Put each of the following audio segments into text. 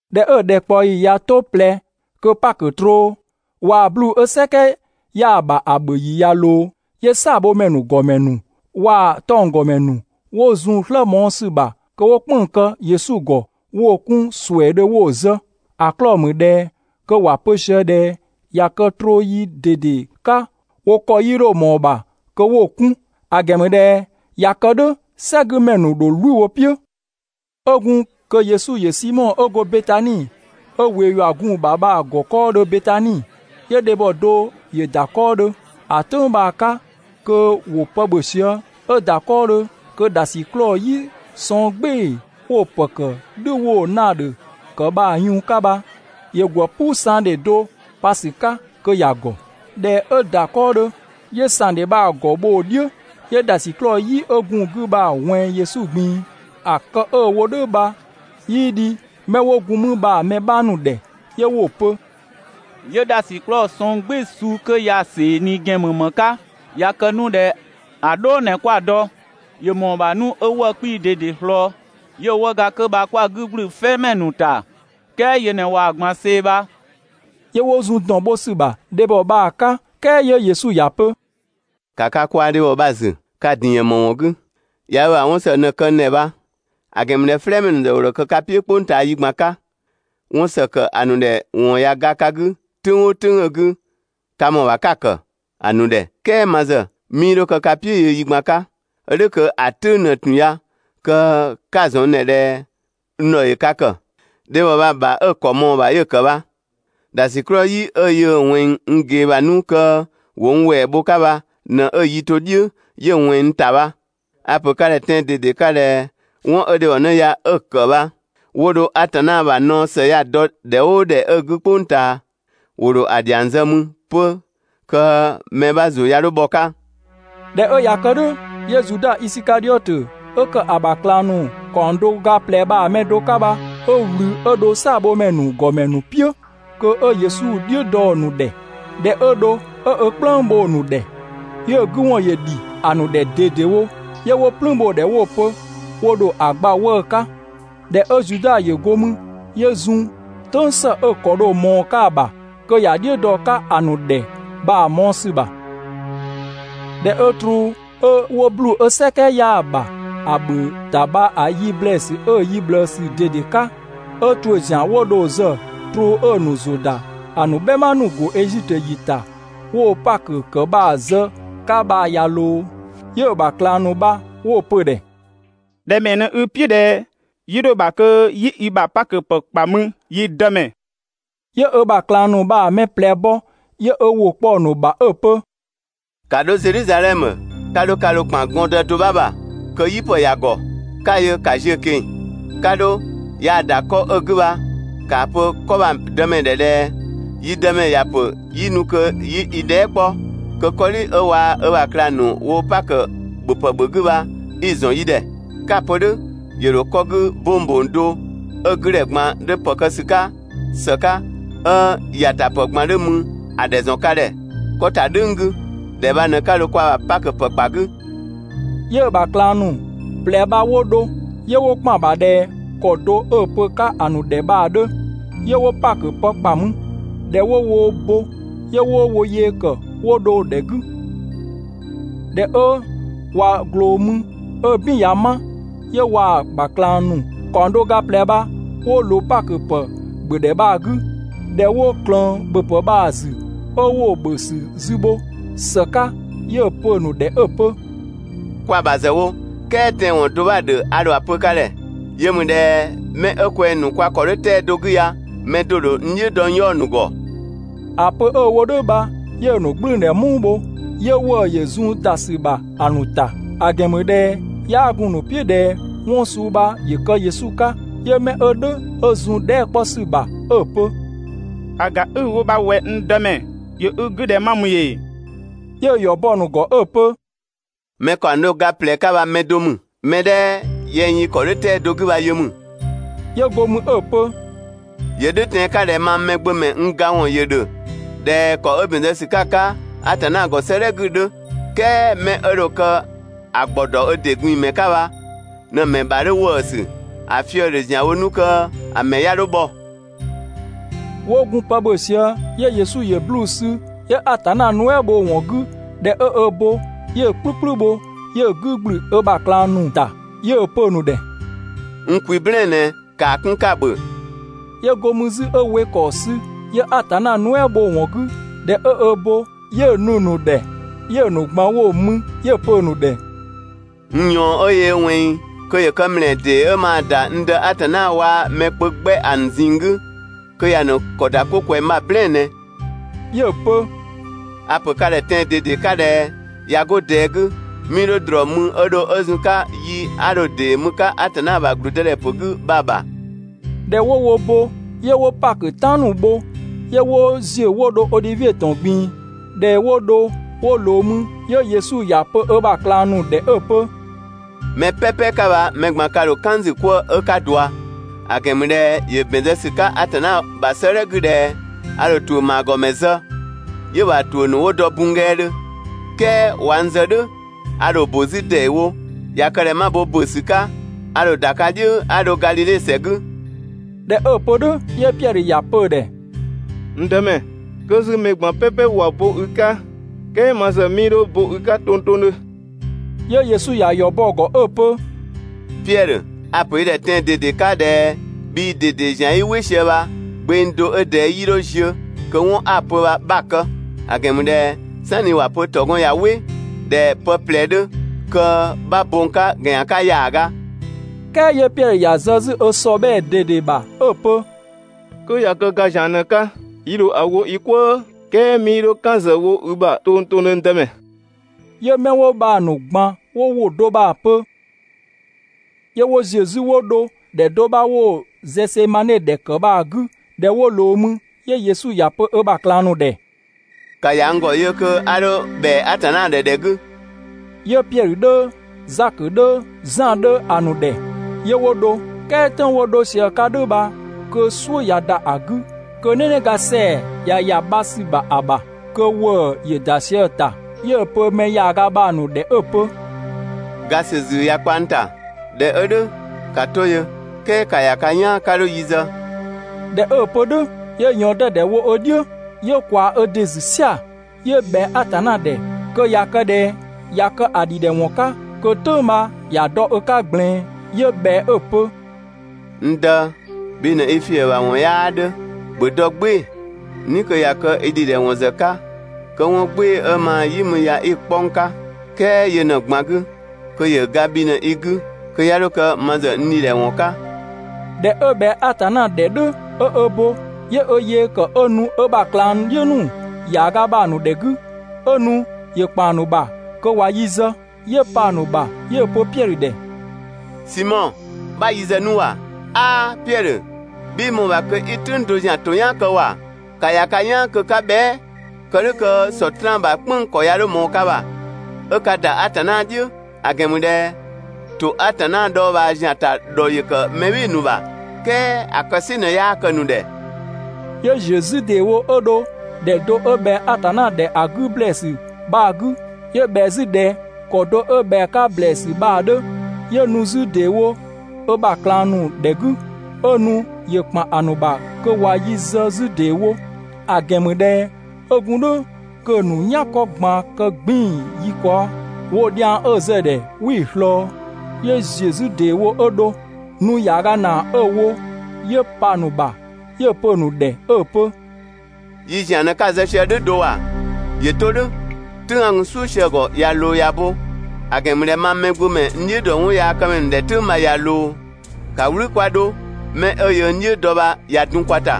꞊Dhɛ 'ö ‑dhɛkpaɔyi ꞊ya 'to ꞊plɛ kö Pakö troo waa‑ 'bluu‑ 'ö "sɛkɛ 'yaa‑ ‑bha ‑a ‑bhö ‑yi ‑yö ꞊loo, 'yö "saabhomɛ ‑nu ‑gɔmɛ ‑nu waa‑ 'tɔnggɔmɛ ‑nu 'wo zun‑ "slë mɔɔ‑ ‑sü ‑bha kö 'wo "kpënng‑ kë Yesu ‑gɔ 'wo‑ 'kun ‑suɛɛdhö 'wo‑ zë. ‑A 'klɔɔ‑ ‑mü ꞊dhɛ kö ‑wa pö sië ꞊dhɛ ꞊ya kë troo yi ꞊dede 'ka wo ‑kɔ 'yii 'dho ꞊mɔɔ‑ ‑bha kö 'wo‑ 'kun, ‑a ‑gɛn ‑mü ꞊dhɛ ꞊ya kë "dhʋ̈ "sɛgümɛ ‑nu ‑dho "wlü wo "piʋ̈. 'Ö gun kö Yesu ‑yö Simɔ 'ö go Betani 'ö ꞊wee ‑yua gun‑ ‑bha bha‑ ‑gɔ 'kɔɔdhö Betani, 'yö dhebhɔ do ‑yö ‑da 'kɔɔdhö, ‑a "tʋ̈ng bha‑ 'ka kö ‑wo pë ‑bhö sië. 'Ö ‑da 'kɔɔdhö kö ‑dhasiklɔɔ "yi sɔng "gbɩɩ‑ 'wo‑ ‑pë ‑kë "dhü 'wo‑ naadhö ‑kë bha‑ yun 'ka bha, ‑yö ‑gwë "puu ‑sangdhe do pa ‑sü 'ka kö ‑ya ‑gɔ. ꞊Dhɛ 'ö ‑da 'kɔɔdhö, 'yö ‑sangdhe bha‑ ‑gɔ bho‑ "dhiʋ̈, 'yö ‑dhasiklɔɔ "yi 'ö gun‑ 'gü bha‑ ꞊wɛnng Yesu ꞊gbin‑. ‑A kë 'ö‑ wo "dhʋ̈ bha 'yii dhi 'mɛ 'wo gun mü bha‑ mɛ 'bha ‑nu ‑dhɛ, 'yö 'wo‑ pö: «'Yö ‑dhasiklɔɔ sɔng "gbɩɩ‑ suu 'kö ya‑ ‑see ꞊ni ‑gɛn ‑mü ‑më 'ka? ꞊Ya kë 'nu ꞊dhɛ ‑a "dhɔɔ ꞊në 'kwa‑ dɔ, ‑yö ‑mɔɔ ‑bha 'nu 'ö 'wëë‑ 'kpii‑ ꞊dede ꞊slɔɔ, 'yö 'wëëga 'kö bha 'kwa‑ 'gü ‑gblü "flɛɛmɛ ‑nu ‑ta, ("kɛɛ yö ꞊në ꞊waa‑ ꞊gban see‑ bha!)» 'Yö 'wo zun ‑dɔn bho ‑sü bha dhebhɔ bha‑ 'ka. "Kɛɛ 'yö Yesu ‑ya pö: «‑Ka ka kwaa dhebhɔ bha‑ ‑zü. Ka‑ ‑din ‑yën ‑më ‑wɔn 'gü? ꞊Ya ö ‑bha 'wɔn ‑së ꞊në kë n ‑dhɛ bha, ‑a ‑gɛn ‑mü ꞊dhɛ "flɛɛmɛ ‑nu ‑zë ‑wo ‑dho kë ka "piʋ̈ "kpʋng ꞊taa yi ꞊gban 'ka, 'wɔn ‑së ‑kë ‑a ‑nu ‑dhɛ ‑wɔn ꞊ya ga ka 'gü "tʋ̈ng "ʋʋ "tʋ̈ng 'ö‑ 'gü ka ‑mɔɔ ‑bha 'ka‑ ‑kë ‑a ‑nu ‑dhɛ, "kɛɛ ma ‑zë, 'mii 'dho kë ka "piʋ̈ yö yi ꞊gban 'ka, 'ö "dhʋ̈ kö ‑a "tʋ̈ng ꞊në ‑tun ya kö 'ka‑ ‑zɔn n ‑dhɛ ꞊dhɛ n ‑dhɔ ‑yö ka ‑kë. Dhebhɔ bha‑ ‑bha 'ö‑ ‑kɔ ꞊mɔɔ‑ ‑bha 'yö‑ kë bha. ‑Dhasiklɔɔ "yi 'ö yöö‑ ꞊wɛnng n ꞊gee ‑bha 'nu kö ‑wo n ‑wɛɛ bho‑ 'ka bha ꞊në 'ö‑ yi to "dhiʋ̈ 'yö ꞊wɛnng n ‑ta bha. A‑ ‑pö ka ‑dhɛ tɛan‑ ꞊dede 'ka ꞊dhɛ 'wɔn 'ö dhebhɔnë ya 'ö‑ ‑kë bha, 'wo dho Atanna ‑bha naɔ ‑së ya‑ dɔ ‑dhɛ "ʋʋ ‑dhɛ 'ö‑ 'gü "kpʋng ꞊taa, ‑wo ‑dho ‑a ‑dhiang zë mü 'pö kö mɛ 'bha ‑zʋ 'ya 'dho bhɔ‑ 'ka.» ꞊Dhɛ 'ö ꞊ya kë "dhʋ̈, 'yö Zuda Isikadhiɔtö 'ö ‑kë ‑a ‑bha ꞊klang ‑nu ‑kaɔng do ga ꞊plɛ bha‑ ‑mɛ do 'ka bha, 'ö ꞊wlü 'ö dho "saabhomɛ ‑nu ‑gɔmɛ ‑nu "piʋ̈, kö 'ö Yesu "dhiʋ̈ dɔ‑ ‑nu ‑dhɛ. ꞊Dhɛ 'ö dho 'ö ö "kplëng bho ‑a ‑nu ‑dhɛ, 'yö‑ 'gü ‑wɔn ‑yö ‑dhi ‑a ‑nu ‑dhɛ ꞊dedewo, 'yö 'wo "plüün bho‑ ‑dhɛ 'wo‑ pö wo ‑dho ‑a gba 'wëë‑ 'ka. ꞊Dhɛ 'ö Zuda ‑yö go mü, 'yö zun "tʋ̈ng ‑së 'ö‑ ‑kɔ dho ꞊mɔɔ‑ 'ka‑ ‑bha kö ‑ya "dhiʋ̈ dɔ‑ 'ka ‑a ‑nu ‑dhɛ bha‑ mɔɔ‑ ‑sü ‑bha. ꞊Dhɛ 'ö troo 'ö 'wo 'bluu‑ 'ö "sɛkɛ 'yaa‑ ‑bha ‑a ‑bhö ‑ta bha‑ yi ‑blɛɛsü 'ö‑ yi ꞊bhlëësü ꞊dede 'ka, 'ö ‑tuʋ̈ ‑zian 'wo dho‑ zë troo 'ö‑ ‑nu ‑zʋ ‑da ‑a ‑nu "bhɛma ‑nu ‑go Ezitö ‑yi ‑ta, 'wo‑ Pakö ‑kë bha‑ zë‑ 'ka bha ꞊ya ꞊loo, 'yö‑ ‑bha ꞊klang ‑nu bha 'wo‑ pö‑ ‑dhɛ: «‑Dhɛ ‑mɛɛ ꞊në i "piʋ̈ ꞊dhɛ 'yi 'dho‑ ‑bha kö 'yi i ‑bha Pakö ‑pë ‑kpa mü, yi Dëmɛ?» 'Yö ö ‑bha ꞊klang ‑nu bha‑ mɛ ꞊plɛ bɔ, 'yö ö ‑wʋ kpɔ‑ ‑nu ‑bha 'ö‑ pö: «‑Ka 'dho Zedhizadhɛmö, 'ka 'dho ka ‑dho ‑kpan gɔndë do 'bha ‑bha kö "yipë ‑ya ‑gɔ, 'ka‑ yö ‑ka ziö‑ ꞊keng‑, 'ka 'dho, yaa‑ ‑da 'kɔ 'ö‑ 'gü bha, ‑kaa pö‑ 'kɔ bha‑ dëmɛ ‑dhɛ ꞊dhɛ: ‹Yi dëmɛ ‑ya ‑pö 'yi nu kö 'yi i dhɛɛ" 'kpɔ kö 'kɔdhi 'ö waa‑ ö ‑bha ꞊klang ‑nu wo dho Pakö ‑bhöpë ‑bhö 'gü bha 'i‑ ‑zɔn yi ‑dhɛ.› 'Ka‑ pö "dhʋ̈, ‑yö ‑dho 'kɔ 'gü 'bong ‑bong do, 'ö‑ 'güdhɛ ꞊gban 'dhö ‑pë kë ‑sü 'ka ‑së 'ka, 'ö ‑yatapë ꞊gban 'dhö mü ‑a ‑dhɛ ‑zɔn ka ‑dhɛ 'kɔ ‑ta "dhʋ̈ng 'gü. ‑Dhɛ bha ꞊në 'ka dho kwa ‑bha Pakö ‑pë ‑kpa ‑a 'gü.» 'Yö‑ ‑bha ꞊klang ‑nu ꞊plɛ bha 'wo dho. 'Yö 'wo ‑kpan ‑bha ꞊dhɛ ‑kɔ do 'ö‑ pö‑ 'ka ‑a ‑nu ‑dhɛ bha‑ 'dhö. 'Yö 'wo Pakö ‑pë ‑kpa mü. ꞊Dhɛ 'wo wo bo, 'yö 'wo wo yee ‑kë 'wo dho‑ ‑dhɛ 'gü. ꞊Dhɛ 'ö ꞊wa ꞊gloo mü 'ö "bin ꞊ya 'ma, 'yö waa‑ ‑bha ꞊klang ‑nu ‑kaɔng do ga ꞊plɛ bha 'wo ꞊loo Pakö ‑pë ‑bhö ‑dhɛ bha‑ 'gü. ꞊Dhɛ 'wo ꞊klëën ‑bhöpë bha‑ ‑zü, 'ö 'wo‑ ‑bhö ‑sü zü bho ‑së 'ka, 'yö‑ pö‑ ‑nu ‑dhɛ 'ö‑ pö: «Kwa‑ ‑bha ‑zë wo, "kɛɛ tɛanwɔn do 'bha‑ ‑dhö 'a dho‑ pö ka ‑dhɛ. Yö ‑mü ꞊dhɛ 'mɛ 'ö kwɛng‑ ‑nu kwa ‑kɔ 'dhö 'tɛa‑ do 'gü ya, mɛ do‑ ‑dho n "dhiʋ̈ dɔ n 'yaɔ‑ ‑nu ‑gɔ ‑A pö 'ö‑ wo "dhʋ̈ bha, 'yö‑ ‑nu "gblʋ̈ʋ̈dhɛ "muu bho, 'yö ‑wëë ‑yö zun ‑da ‑sü ‑bha ‑a ‑nu ‑ta, ‑a ‑gɛn ‑mü ꞊dhɛ 'yaa gun‑ ‑nu "piʋ̈ ꞊dhɛ 'wɔn suu bha ‑yö kë Yesu 'ka. 'Yö 'mɛ 'ö "dhʋ̈ 'ö zun‑ dhɛɛ" 'kpɔ ‑sü ‑bha 'ö‑ pö: «‑A ‑ga 'i‑ wo bha ꞊wɛ, n Dëmɛ, ‑yö i 'gü ꞊dhɛ ma ‑mü ‑ee?» 'Yö‑ ‑yɔ bɔ‑ ‑nu ‑gɔ 'ö‑ pö: «Mɛ ‑kaɔng do ga ꞊plɛ 'ka bha mɛ do ‑mü. Mɛ 'dhɛ yɛng yi ‑kɔ 'dhö 'tɛa‑ do 'gü bha yö ‑mü.» 'Yö go mü 'ö‑ pö: «‑Yö "dhʋ̈ tɛan‑ 'ka ꞊dhɛ mang Mɛgbömɛ n ga ‑wɔn ‑yö ‑dhö ꞊dhɛ ‑kɔ 'ö ‑bɛn zë ‑sü 'ka‑ 'ka Atanna ‑gɔ 'sëëdhɛ 'gü‑ 'dhö, "kɛɛ 'mɛ 'ö dho kë ‑a ‑gbɔ ‑dɔ ö ‑dɩ ꞊gbin‑ ‑mɛ 'ka bha ꞊në‑ ‑mɛ ‑bha 'dhö ‑wëësü. ‑A fië‑ ‑dhö ‑zianwo 'nu kö‑ ‑mɛ 'ya 'dho bhɔ.» 'Wo gun pë ‑bhö sië, 'yö Yesu ‑yö 'bluu‑ sü, 'yö Atanna nuɛ" bho‑ ‑wɔn 'gü, ꞊dhɛ 'ö ö bo, 'yö‑ "kplü "kplü bho, 'yö‑ 'gü ‑gblü ö ‑bha ꞊klang ‑nu ‑ta, 'yö‑ pö‑ ‑nu ‑dhɛ: «N kwi "blɛɛn‑ ꞊nɛ, ‑kaa 'kun 'ka‑ ‑bhö.» 'Yö go mü 'zü 'ö we ‑kɔɔ sü, 'yö Atanna nuɛ" bho‑ ‑wɔn 'gü, ꞊dhɛ 'ö ö bo, 'yö‑ nu‑ ‑nu ‑dhɛ, 'yö‑ ‑nu ꞊gban 'wo‑ mü. 'Yö‑ pö‑ ‑nu ‑dhɛ: «N ꞊yɔɔn 'ö yöö ‑wɛnng kö ‑yö kë ‑mlɛɛ ‑dee 'ö maa‑ ‑da n Dë Atanna waa‑ mɛ kpö 'gbɛ ‑a ‑nu ꞊zinng 'gü kö ‑ya ‑nu ‑kɔ ‑da 'ko ꞊kwɛng bha‑ "blɛɛn‑ ꞊nɛ.» 'Yö‑ pö: «A‑ ‑pö ka ‑dhɛ tɛan‑ ꞊dede 'ka ꞊dhɛ: ꞊Ya 'go ꞊dɛɛ 'gü, 'mii 'dho ‑drɔɔ mü 'ö dho 'ö zun‑ 'ka yi 'a dho‑ ‑dee mü‑ 'ka Atanna ‑bha ‑gblüdëdhɛpö 'gü bha‑ ‑bha.» ꞊Dhɛ 'wo wo bo 'yö 'wo Pakö "tan ‑nu bho, 'yö 'wo ‑ziö 'wo dho Odhivie ‑tɔn ꞊gbin‑. ꞊Dhɛ 'wo dho 'wo ꞊loo mü 'yö Yesu ‑ya pö ö ‑bha ꞊klang ‑nu ‑dhɛ 'ö‑ pö: «Mɛ "pɛpɛ 'ka bha mɛ ꞊gban ka ‑dho "kan n ‑zü 'kwëë‑, 'ö 'ka ꞊dua. ‑A ‑gɛn ‑mü ꞊dhɛ ‑yö ‑bɛn zë ‑sü 'ka Atanna ‑bha 'sëëdhɛ 'gü ꞊dhɛ: A ‑dho ‑tuʋ̈ ‑maagɔmɛ zë, 'yö‑ ‑bha ‑tuʋ̈ ‑nu 'wo dɔ bunnggɛɛdhö. "Kɛɛ ꞊wa n zë "dhʋ̈, a ‑dho ‑bö 'zü ‑deewo. ꞊Ya kë ꞊dhɛ 'ma bo ‑bö ‑sü 'ka, a ‑dho ‑da ka "dhiʋ̈ 'a dho Gadhidhe ‑sɛ 'gü.» ꞊Dhɛ 'ö‑ pö "dhʋ̈, 'yö Piɛdhö ‑ya pö‑ ‑dhɛ: «(N Dëmɛ,) 'kö 'zü mɛ ꞊gban "pɛpɛ ꞊wa bo i 'ka, "kɛɛ ma ‑zë, 'mii 'dho bo i 'ka tongtongdhö.» 'Yö Yesu ‑ya ‑yɔ bɔ‑ ‑gɔ 'ö‑ pö: «Piɛdhö, a‑ ‑pö i ‑dhɛ tɛan‑ ꞊dede 'ka ꞊dhɛ bhii ꞊dede ‑zian 'i "wɩ sië bha, gbeng do 'ö ꞊dɛɛ 'yii 'dho ziö kö 'wɔn 'a‑ pö bha 'bha‑ kë. ‑A ‑gɛn ‑mü ꞊dhɛ "sanni ‑wa pö ‑tɔgɔn ꞊ya "wɩ ꞊dhɛ pë ꞊plɛ 'dhö, kö 'bha bo n 'ka ‑gɛnyan 'ka ‑yaaga.» "Kɛɛ 'yö Piɛdhö ‑ya zë 'zü ö ‑sɔbhɛɛ ꞊dede ‑bha 'ö‑ pö: «'Kö ꞊ya kë ga ‑zian ꞊në‑ 'ka, yi ‑dho ‑a wo yi "kwëë, "kɛɛ 'mii 'dho "kan ‑zë wo i ‑bha tongtongdhö, n Dëmɛ.» 'Yö 'mɛ 'wo bha‑ ‑nu ꞊gban 'wo ‑wʋ do bha‑ pö. 'Yö 'wo ‑ziö 'zü 'wo dho ‑dhɛ do 'bha 'wo‑ Zɛsemane ‑dhɛ ‑kë bha‑ 'gü. ꞊Dhɛ 'wo ꞊loo mü 'yö Yesu ‑ya pö ö ‑bha ꞊klang ‑nu ‑dhɛ: «‑Ka ‑ya n ‑gɔ yö kö 'a 'dho ‑bhɛa Atanna ‑dhɛ ‑dhɛ 'gü.» 'Yö Piɛdhö 'dhö, Zakö 'dhö, Zan 'dhö ‑a ‑nu ‑dhɛ, 'yö 'wo dho. "Kɛɛ "tʋ̈ng 'wo dho sië‑ 'ka "dhʋ̈ bha, kö "suʋ̈ ꞊ya ‑da ‑a 'gü, kö "nɛnɛga ‑sɛa ꞊ya ‑ya bha ‑sü ‑bha ‑a ‑bha, kö ‑wëë ‑yö ‑da sië‑ ‑ta. 'Yö‑ pö mɛ ‑yaaga bha‑ ‑nu ‑dhɛ 'ö‑ pö: «Ga ‑sü zii ꞊ya kpa n ‑ta, ꞊dhɛ 'ö "dhʋ̈, ‑ka 'to yö, "kɛɛ ‑ka ‑ya ka "yaan 'ka 'dho yi zë.» ꞊Dhɛ 'ö‑ pö "dhʋ̈, 'yö ꞊yɔɔn 'dɛdɛ wo ö "dhiʋ̈, 'yö ꞊kwaa ö ‑dɩ ‑zü "sia‑, 'yö ꞊bhɛa Atanna ‑dhɛ kö ꞊ya kë ꞊dhɛ ꞊ya kë‑ ‑dhidhɛwɔn 'ka, kö "tʋ̈ng bha ‑ya dɔ ö 'ka ꞊gblɛɛn. 'Yö ꞊bhɛa 'ö‑ pö: «N Dë, bhi ꞊në i ‑fiëbhawɔn 'yaa 'dhö, ‑bhö dɔ "gbɩɩ‑, "ni kö ꞊ya kë i ‑dhidhɛwɔn ‑zë 'ka, kö 'wɔn "gbɩɩ‑ 'ö maa‑ "yi mü ya 'i‑ 'kpɔ n 'ka, "kɛɛ yö ꞊në‑ ꞊gban 'gü, kö ‑yö ga bhi ꞊në i 'gü, kö 'ya 'dho kë ma ‑zë n ‑dhidhɛwɔn 'ka.» ꞊Dhɛ 'ö ꞊bhɛa Atanna ‑dhɛ "dhʋ̈ 'ö ö bo, 'yö ö yee ‑kë 'ö nu ö ‑bha ꞊klangdhiʋ̈ ‑nu ‑yaaga bha‑ ‑nu ‑dhɛ 'gü. 'Ö nu ‑yö ‑kpan ‑nu ‑bha kö ꞊wa yi zë. 'Yö pa‑ ‑nu ‑bha 'yö‑ pö Piɛdhö ‑dhɛ: «Simɔ, 'bha yi zë 'nu ‑wa! 'Aa, Piɛdhö, bhii ꞊mɔɔ‑ ‑bha kö 'i "tʋ̈ng do ‑zian ‑to "yaan kë ‑wa? ‑Ka ‑ya ka "yaan kö 'ka bhɛa", kë "dhʋ̈ kö Sɔtraan ‑bha "kpënng‑ ‑kɔ 'ya 'dho ꞊mɔɔ ka ‑bha 'ö ka ‑da Atanna "dhiʋ̈, ‑a ‑gɛn ‑mü ꞊dhɛ ‑to Atanna dhɔɔbhaa ‑zian ‑ta ‑dhɔ ‑yö kë mɛ "bhɩɩ‑ ‑nu ‑bha, "kɛɛ ‑a kë "sɩ ꞊në 'yaa kë‑ ‑nu ‑dhɛ.» 'Yö ‑ziö 'zü ‑deewo 'ö dho ‑dhɛ do 'ö ꞊bhɛa Atanna ‑dhɛ ‑a 'gü ‑blɛɛsü bha‑ 'gü, 'yö ꞊bhɛa 'zü ꞊dhɛ ‑kɔ do 'ö ꞊bhɛa‑ 'ka ‑blɛɛsü bha‑ 'dhö. 'Yö nu 'zü ‑deewo ö ‑bha ꞊klang ‑nu ‑dhɛ 'gü, 'ö nu ‑yö ‑kpan ‑a ‑nu ‑bha kö ꞊wa yi zë 'zü ‑deewo. ‑A ‑gɛn ‑mü ꞊dhɛ 'ö gun "dhʋ̈ kö‑ ‑nu "yankɔ ꞊gbaan kë 'gbiin‑ yi kaɔ. Woo dhiang 'ö‑ zë‑ ‑dhɛ 'wii‑ ꞊slɔɔ. 'Yö ‑ziö 'zü ‑deewo 'ö dho. Nu ‑yaaga ‑naa 'ö‑ wo, 'yö pa‑ ‑nu ‑bha 'yö‑ pö‑ ‑nu ‑dhɛ 'ö‑ pö: «Yi ‑zian ꞊në 'ka‑ zë sië "dhʋ̈ do ‑wa! ‑Yö 'to "dhʋ̈! "Tʋ̈ng 'a gun "suʋ̈ sië‑ ‑gɔ ꞊ya ꞊loo ‑ya bo, ‑a ‑gɛn ‑mü ꞊dhɛ mang Mɛgbömɛ n "dhiʋ̈ ‑dɔ 'wɔnyaakëmɛ ‑nu ‑dhɛ "tʋ̈ng bha ꞊ya ꞊loo. ‑Ka "wlü 'kwa 'dho, 'mɛ 'ö yöö n "dhiʋ̈ dɔ bha ꞊ya dun kwa ‑ta.»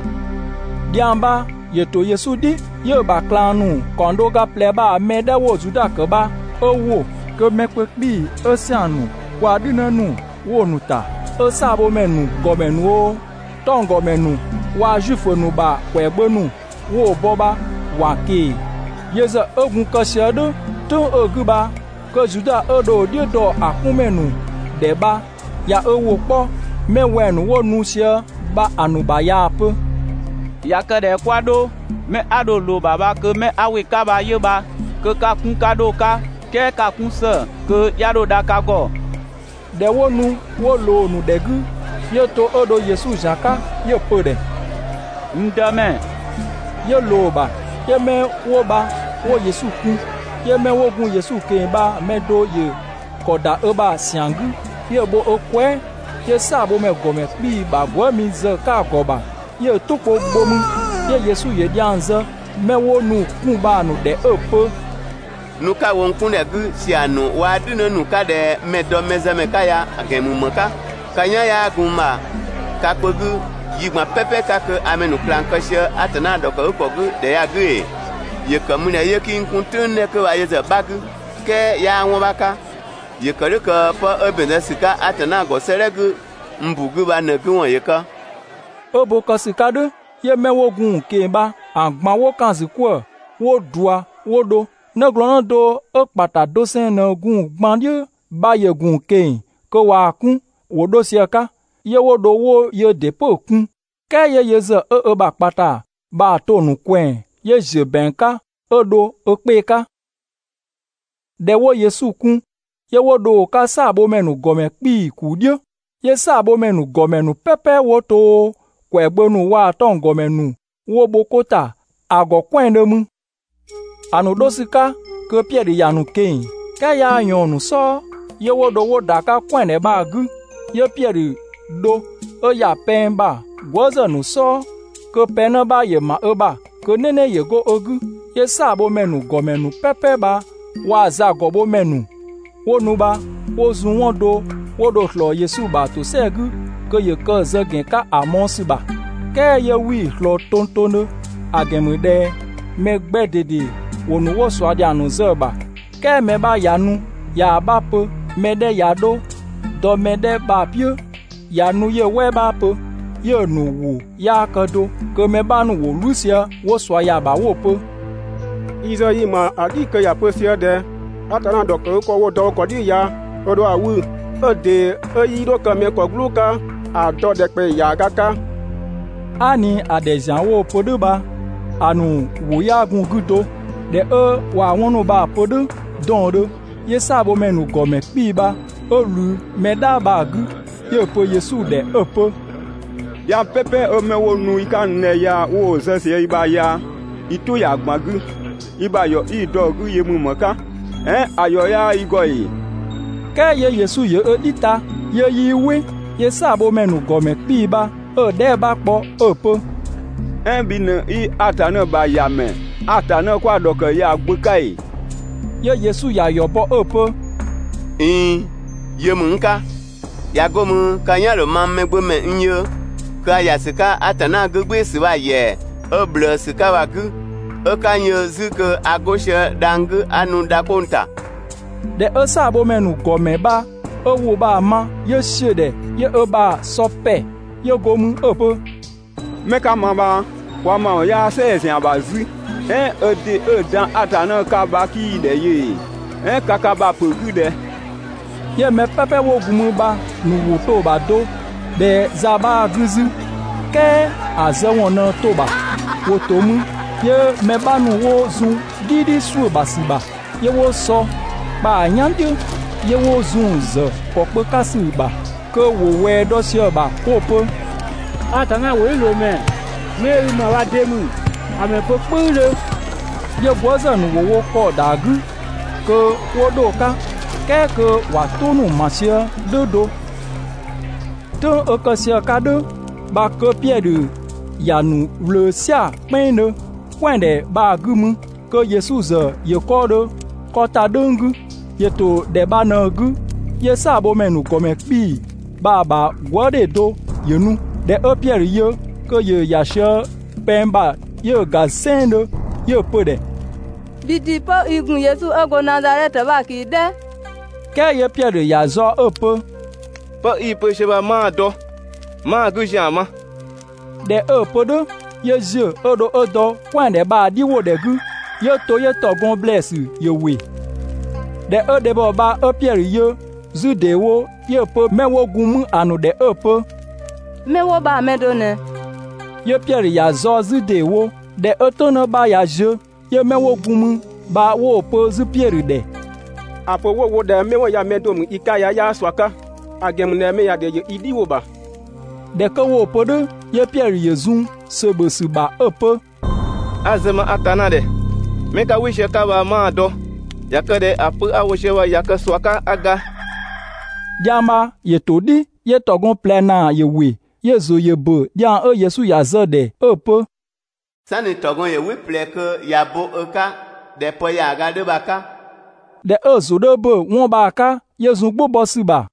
Dhiang bha ‑yö ‑to Yesu "dhi, 'yö‑ ‑bha ꞊klang ‑nu ‑kaɔng do ga ꞊plɛ bha‑ mɛ 'dhɛ 'wo Zuda ‑kë bha 'ö ‑wo, kö mɛ kpö 'kpii‑ 'ö ‑siang ‑nu waa‑ "dhünë ‑nu 'wo‑ ‑nu ‑ta, 'ö "saabhomɛ ‑nu ‑gɔmɛ ‑nu oo, 'tɔnggɔmɛ ‑nu waa‑ Zuifö ‑nu ‑bha ‑kwɛagbö ‑nu 'wo‑ bɔ bha ‑wa ꞊keng‑. Yö ‑zë 'ö gun kë sië "dhʋ̈ "tʋ̈ng 'ö‑ 'gü bha kö Zuda 'ö dho‑ "dhiʋ̈ dɔ‑ 'kunmɛ ‑nu ‑dhɛ bha ꞊ya ö ‑wʋ 'kpɔ 'mɛ wɛng‑ ‑nu 'wo nu sië bha‑ ‑nu ‑bha ꞊yaa‑ pö: «꞊Ya kë ꞊dhɛ 'kwa 'dho, 'mɛ 'a dho‑ ꞊loo‑ ‑bha bha kö 'mɛ 'a ‑wɩ 'ka bha 'yö bha, kö 'ka‑ 'kun 'ka 'dho‑ 'ka, "kɛɛ 'ka‑ 'kun ‑së (kö 'ya 'dho dha ka ‑gɔ).» ꞊Dhɛ 'wo nu 'wo ꞊loo‑ ‑nu ‑dhɛ 'gü, 'yö to 'ö dho Yesu ‑zian 'ka, 'yö‑ pö‑ ‑dhɛ: «N Dëmɛ!» 'Yö‑ ꞊loo‑ ‑bha, 'yö 'mɛ 'wo bha 'wo Yesu kun. 'Yö 'mɛ 'wo gun Yesu ꞊keng‑ bha‑ mɛ do ‑yö ‑kɔ ‑da ö ‑bha ‑siang 'gü, 'yö bho ö kwɛɛ", 'yö "saabhomɛ ‑gɔmɛ 'kpii‑ ‑bha gwëëmi zë‑ 'ka‑ ‑gɔ ‑bha, 'yö‑ "tʋ kpö bho mü. 'Yö Yesu ‑yö dhiang zë 'mɛ 'wo nu‑ 'kun bha‑ ‑nu ‑dhɛ 'ö‑ pö: «Nu 'ka‑ wo n 'kun ‑dhɛ 'gü ‑siang ‑nu waa‑ "dhünë ‑nu 'ka ꞊dhɛ mɛ‑ dɔ mɛzëmɛ 'ka ya‑ ‑gɛn ‑mü ‑më 'ka? Ka "yan 'yaa gun n ‑bha ka kpö 'gü yi ꞊gban "pɛpɛ 'ka kö a mɛ ‑nu ꞊klang kë sië Atanna ‑dhɔkëgükɔ 'gü ‑dhɛ ya 'gü ‑ee? ‑Yö ‑kë ‑mü ꞊dhɛ 'yö 'kii n 'kun‑ "tʋ̈ng 'dhɛ 'kö bha yö ‑zë 'bha 'gü? "Kɛɛ 'yaa 'wɔn 'bha 'ka, ‑yö ‑kë "dhʋ̈ kö 'pë 'ö ‑bɛn zë ‑sü 'ka Atanna ‑gɔ 'sëëdhɛ 'gü n ‑bu 'gü bha ꞊në‑ 'gü ‑wɔn ‑yö kë.» 'Ö bo kë ‑sü 'ka "dhʋ̈, 'yö 'mɛ 'wo gun‑ ꞊keng‑ bha‑ ꞊gban 'wo ‑kan ‑zü 'kwëë‑ 'wo ꞊dua 'wo dho. 'Nëglɔɔnnë do 'ö ‑kpata doseng ꞊në gun‑ gban "dhiʋ̈ bha ‑yö ‑gun ꞊keng‑ kö ꞊waa‑ 'kun ‑wo 'dho sië‑ 'ka. 'Yö 'wo dho 'wo yöö ‑dɩ 'pö‑ kun. "Kɛɛ 'yö yö ‑zë 'ö ö ‑bha ‑kpata bha‑ to‑ ‑nu ꞊kwɛɛ‑ 'yö ‑ziö ‑bɛang 'ka 'ö dho ö 'kpee‑ 'ka. ꞊Dhɛ 'wo Yesu kun, 'yö 'wo dho‑ 'ka "saabhomɛ ‑nu ‑gɔmɛ 'kpii‑ ‑kuu "dhiʋ̈, 'yö "saabhomɛ ‑nu ‑gɔmɛ ‑nu "pɛpɛ 'wo to oo, ‑kwɛagbö ‑nu waa‑ 'tɔnggɔmɛ ‑nu 'wo bho 'ko ‑ta ‑a ‑gɔ "kwɛandhö mü. ‑A ‑nu 'dho ‑sü 'ka kö Piɛdhö ‑ya ‑nu ꞊keng‑, "kɛɛ 'yaa ꞊yɔɔn‑ ‑nu "sɔɔ, 'yö 'wo dho 'wo ‑da 'ka "kwɛandhɛ bha‑ 'gü. 'Yö Piɛdhö dho 'ö ‑ya pɛng ‑bha gwëëzë ‑nu "sɔɔ, kö pɛng 'në 'bha ‑yö ‑ma ö bha kö "nɛnɛ ‑yö go ö 'gü. 'Yö "saabhomɛ ‑nu ‑gɔmɛ ‑nu "pɛpɛ bha waa‑ zagɔbhomɛ ‑nu 'wo nu bha 'wo zun 'wɔn do 'wo dho‑ ꞊slɔɔ Yesu ‑bha ‑tosɛa 'gü kö ‑yö kë‑ zë ‑gɛn 'ka ‑a mɔɔ‑ ‑sü ‑bha, "kɛɛ 'yö 'wii‑ ꞊slɔɔ tongtongdhö. ‑A ‑gɛn ‑mü ꞊dhɛ mɛ 'gbɛ ꞊dede ‑wo nu 'wo ꞊sua ‑dhiang ‑nu zë‑ ‑bha, "kɛɛ mɛ 'bha ꞊ya nu ꞊yaa‑ 'bha pö, mɛ 'dhɛ ꞊ya 'dho dɔ mɛ 'dhɛ bha‑ "piʋ̈, ꞊ya nu 'yö‑ "wɛɛ 'bha pö, 'yö‑ ‑nu ‑wʋ 'yaa kë do. Kö mɛ 'bha ‑nu ‑wo "wlü sië 'wo ꞊sua ‑ya ‑bha 'wo‑ pö: «Yi ‑zë yi‑ ‑ma "dhi kö ‑ya pö sië ꞊dhɛ: ‹Atanna ‑dhɔkëgükɔ 'wo‑ dɔ wo ‑kɔ "dhiʋ̈ ya, ö ‑dho ‑a 'wü 'ö‑ ‑dee 'ö 'yii dho kë mɛ ‑kɔ "gblʋʋ 'ka 'a‑ dɔ ‑dhɛkpaɔyi ‑yaaga 'ka.› Aa" ꞊ni ‑a ‑dhɛ ‑zian 'wo‑ pö "dhʋ̈ bha, ‑a ‑nu ‑wʋ 'yaa gun‑ 'gü do. ꞊Dhɛ 'ö ꞊wa 'wɔn ‑nu bha‑ pö "dhʋ̈ 'dɔɔndhö, 'yö "saabhomɛ ‑nu ‑gɔmɛ 'kpii‑ bha 'ö ꞊wlü mɛ "dhaa bha‑ 'gü, 'yö‑ pö Yesu ‑dhɛ 'ö‑ pö: «Dhiang "pɛpɛ 'ö 'mɛ 'wo nu i 'ka n ‑dhɛ ya 'wo‑ zë i ‑bha ya i "tʋ ‑ya ꞊gban 'gü, i ‑bha ‑yɔ 'i‑ dɔ‑ 'gü yö ‑mü ‑më 'ka? "Ɛɛn ‑a ‑yɔ 'yaa i ‑gɔ ‑ee?» "Kɛɛ 'yö Yesu ‑yö ö "dhi ta, 'yö 'yii "wɩ. 'Yö "saabhomɛ ‑nu ‑gɔmɛ 'kpii‑ bha 'ö‑ dhɛɛ" 'bha kpɔ 'ö‑ pö: «"Ɛɛn bhi ꞊në 'i Atanna ‑bha ‑Yamɛ, Atanna 'kwa‑ ‑dhɔkë ya‑ Gbö 'ka ‑ee?» 'Yö Yesu ‑ya ‑yɔ bɔ 'ö‑ pö: «꞊Iin, yö ‑mü n 'ka. ꞊Ya 'go mü ka "yan ‑dho mang Mɛgbömɛ n yö kö a ‑ya ‑sü 'ka Atanna 'gügbɩɩsü bha‑ ‑yɛa 'ö ꞊bhlëësü 'ka bha‑ 'gü, 'ö 'ka n yö 'zü kö a 'go sië dhang‑ 'gü 'a nu dha 'kpong‑ ‑ta.» ꞊Dhɛ 'ö "saabhomɛ ‑nu ‑gɔmɛ bha 'ö ‑wʋ bha‑ ma, 'yö ‑siö ‑dhɛ, 'yö ö ‑bha ‑sɔ ‑pɛ, 'yö go mü 'ö‑ pö: «'Mɛ 'ka ma bha, kwa ‑mawɔn 'yaa "sɛɛ‑ ‑zian ‑bha 'zü. "Ɛɛn ö ‑dɩ 'ö‑ dan Atanna 'ka bha 'kii‑ ‑dhɛ yö ‑ee? "Ɛɛn ka ka ‑bha pö‑ 'gü ꞊dhɛ?» 'Yö mɛ "pɛpɛ 'wo gun mü bha‑ ‑nu ‑wʋ 'dhö to‑ ‑bha do ꞊dhɛ za 'bhaa‑ 'gü 'zü, "kɛɛ ‑a zë ‑wɔn ꞊në to‑ ‑bha.» ‑Wo ‑to mü 'yö mɛ 'bha ‑nu 'wo zun "dhidhi ‑suʋ̈ ‑bha ‑sü ‑bha, 'yö 'wo sɔ kpa‑ "yan "dhiʋ̈, 'yö 'wo zun‑ ‑zë ‑kɔkpö 'ka ‑sü ‑bha kö ‑wo ꞊wɛɛ dɔ sië‑ ‑bha 'wo‑ pö: «Atanna ‑wʋdhiʋ̈loomɛ, 'mɛ 'ö i ‑ma bha de ‑mü? ‑A ‑mɛ pö "kpʋ̈üdhö!» 'Yö gwëëzë ‑nu 'wo wo ‑kɔ ‑da 'gü kö 'wo 'dho‑ 'ka, "kɛɛ kö ‑wa "tʋ ‑nu ‑ma sië "dhʋ̈ do. "Tʋ̈ng 'ö kë sië‑ 'ka "dhʋ̈ bha kö Piɛdhö ‑ya ‑nu ꞊wlöö "sia‑ "kpɛnngdhö, "kwɛandhɛ bha‑ 'gü mü kö Yesu ‑zë ‑yö 'kɔɔdhö 'kɔ ‑ta "dhʋ̈ng 'gü. ‑Yö ‑to ‑dhɛ bha ꞊në‑ 'gü, 'yö "saabhomɛ ‑nu ‑gɔmɛ 'kpii‑ bha‑ ‑bha gwëëdhe do ‑yö nu. ꞊Dhɛ 'ö Piɛdhö yö kö ‑yö ‑ya sië pɛng ‑bha, 'yö‑ ‑ga "sɛnngdhö, 'yö‑ pö‑ ‑dhɛ: «Bhii ‑dɩ 'pö i ‑gun Yesu 'ö go Nazadhɛtö bha‑ ꞊keng‑ "dhɛ!» "Kɛɛ 'yö Piɛdhö ‑ya ꞊zaɔ 'ö‑ pö: «'Pë 'i‑ pö sië bha 'maa‑ dɔ, 'maa‑ 'gü ‑zian ma.» ꞊Dhɛ 'ö‑ pö "dhʋ̈ 'yö ‑ziö 'ö dho 'ö dɔ "kwɛandhɛ bha‑ "dhi ‑wo ‑dhɛ 'gü, 'yö to 'yö ‑tɔgɔn ‑blɛɛsü ‑yö ‑wɩ. ꞊Dhɛ 'ö dhebhɔ bha 'ö Piɛdhö yö 'zü ‑deewo, 'yö‑ pö 'mɛ 'wo gun mü ‑a ‑nu ‑dhɛ 'ö‑ pö: «'Mɛ 'wo bha‑ mɛ do ꞊nɛ!» 'Yö Piɛdhö ‑ya ꞊zaɔ 'zü ‑deewo. ꞊Dhɛ 'ö "tʋ̈ng 'në 'bha ꞊ya ziö, 'yö 'mɛ 'wo gun mü bha 'wo‑ pö 'zü Piɛdhö ‑dhɛ: «‑A pö 'wo‑ wo ꞊dhɛ 'mɛ 'wo ya‑ mɛ do ‑mü i 'ka ya 'yaa ꞊sua 'ka; ‑a ‑gɛn ‑mü ꞊dhɛ [mɛ ‑ya ‑dhɛ ‑yö i "dhiwʋ ‑bha].» ꞊Dhɛ 'kö 'wo‑ pö "dhʋ̈, 'yö Piɛdhö ‑yö zun ‑sö ‑bhö ‑sü ‑bha 'ö‑ pö: «'A‑ zë ma Atanna ‑dhɛ, 'mɛ 'ka "wɩ sië‑ 'ka bha, 'maa‑ dɔ. (꞊Ya kë ꞊dhɛ ‑a pö 'a‑ wo sië ya ꞊ya kë ꞊sua 'ka 'a ga!)» Dhiang bha ‑yö ‑to "dhi, 'yö ‑tɔgɔn ꞊plɛ ‑naa ‑yö ‑wɩ. 'Yö‑ ‑zʋ ‑yö ‑bö dhiang 'ö Yesu ‑ya zë‑ ‑dhɛ 'ö‑ pö: «"Sanni ‑tɔgɔn ‑yö "wɩ ꞊plɛ kö ꞊ya bo ö 'ka ꞊dhɛ pë ‑yaaga 'dhö bha‑ 'ka. ꞊Dhɛ 'ö‑ ‑zʋ 'dhö ‑bö 'wɔn bha‑ 'ka, 'yö zun "gbʋ bɔ ‑sü ‑bha.